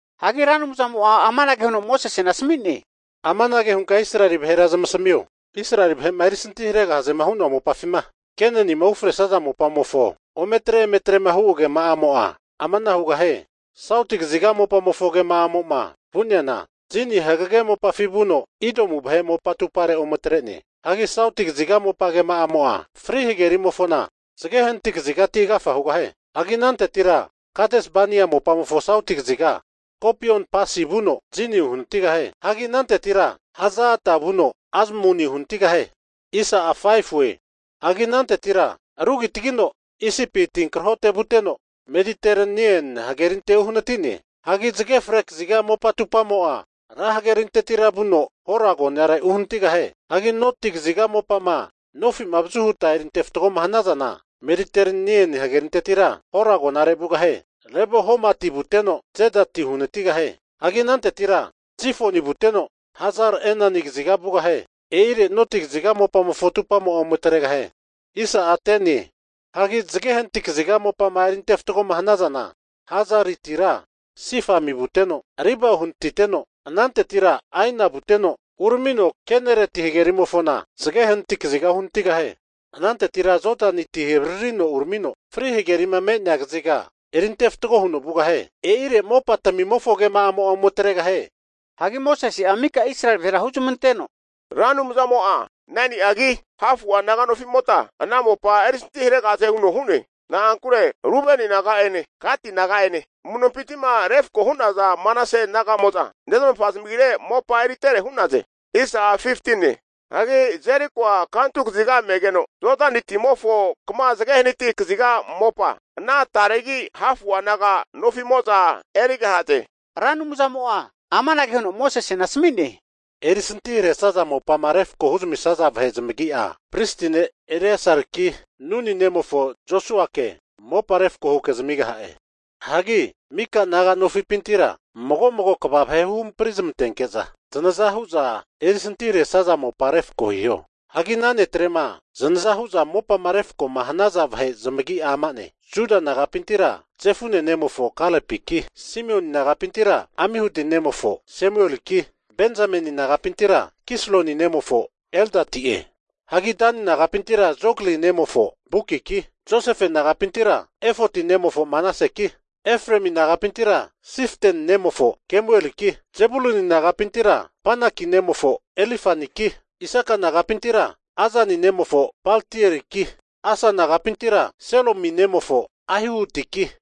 Hagi Ra Anumzamo'a amanage huno Mosesena asami'ne, Amanage hunka Israeli vahera zamasamio, Israeli vahe'ma erisanti haregahaze hu'noa mopafima Kenanima ufresaza mopamofo ometre emetrema hu agema'amo'a amanahu hugahie. Sauti kaziga mopamofo agema'amo'ma vu'neana, Zini hagege mopafi vuno Idomu vahe mopa atupare ometre'ne. Hagi sauti kaziga mopa agema'amo'a Fri Hagerimofona zage hanati kazigati agafa hugahie. Hagi anantetira Kades Bania mopamofona sauti kaziga Skopion Pasi vuno Zini uhanatigahie. Hagi anantetira Haza Ada vuno Azmoni uhanatigahie. Hagi anantetira rugitagino Isipi tinkrahote vuteno, Mediterenia Hagerinte uhanati'ne. Hagi zage fre kaziga mopa atupamo'a, Ra Hagerintetira vuno Hora agonare uhanatigahie. Hagi noti kaziga mopama nofi'ma avazu huta eri antefatgoma hanazana, Mediterenia hagerintetira Hora agonare vugahie. Lebo Hamati vuteno Zedati uhanatigahie. Hagi anantetira Zifoni vuteno, Hazar-Enan kaziga vugahie. E'ire noti kaziga mopamofo atupamo'a ome atregahie. Hagi zage hanati kaziga mopama eri ante fatgoma hanazana, Hazaritira Sifami vuteno, Riba uhanatiteno anantetira Aina vuteno, uramino Kenareti hagerimofona (Galili) zage hanati kaziga uhanatigahie. Anantetira Jodani ti avaririno uramino Fri Hagerima me'nea kaziga eri ante fatgo huno vugahie. E'ire mopatamimofo agema'amo'a ome atregahie. Hagi Mosese'a mika Israeli vahera huzmanteno, Ra Anumzamo'a 9ni'agi hafu'a naga nofimota ana mopa erisantiharegahaze huno hu'ne. Na'ankure Rubeni naga'ene Gati naga'ene amu'nompinti'ma refako hu'naza Manase naga'mo'za nezmafa zamagire mopa eritere hu'naze. Hagi Jerikoa kantu kaziga megeno, Jodani timofo kama zage hanati kaziga mopa ana taregi hafu'a naga nofimo'za erigahaze. Ra Anumzamo'a amanage huno Mosesena asami'ne, Erisantiharesaza mopama refko huzamisaza vahe zamagi'a, pristi ne' Eleasariki, Nuni nemofo Josuake mopa refako huke zamigaha'e. Hagi mika' naga nofipintira mago mago kva vahe huhampri zamantenke'za zanaza hu'za erisantiharesaza mopa refko hiho. Hagi ana netrema zanaza hu'za mopama refko hanaza vahe zamagi'a ama'ne, Juda nagapintira Jefune nemofo Kalepiki, Simioni nagapintira Amihudi nemofo Semueliki, Benzameni nagapintira Kisloni nemofo Elidadi'e. Hagi Dani nagapintira Jogli nemofo Bukiki, Josefe nagapintira Efoti nemofo Manaseki, Efremi nagapintira Siften nemofo Kemueliki, Zebuluni nagapintira Panaki nemofo Elizafaniki, Isaka nagapintira Azani nemofo Paltieliki, Asa nagapintira Selomi nemofo Ahihutiki,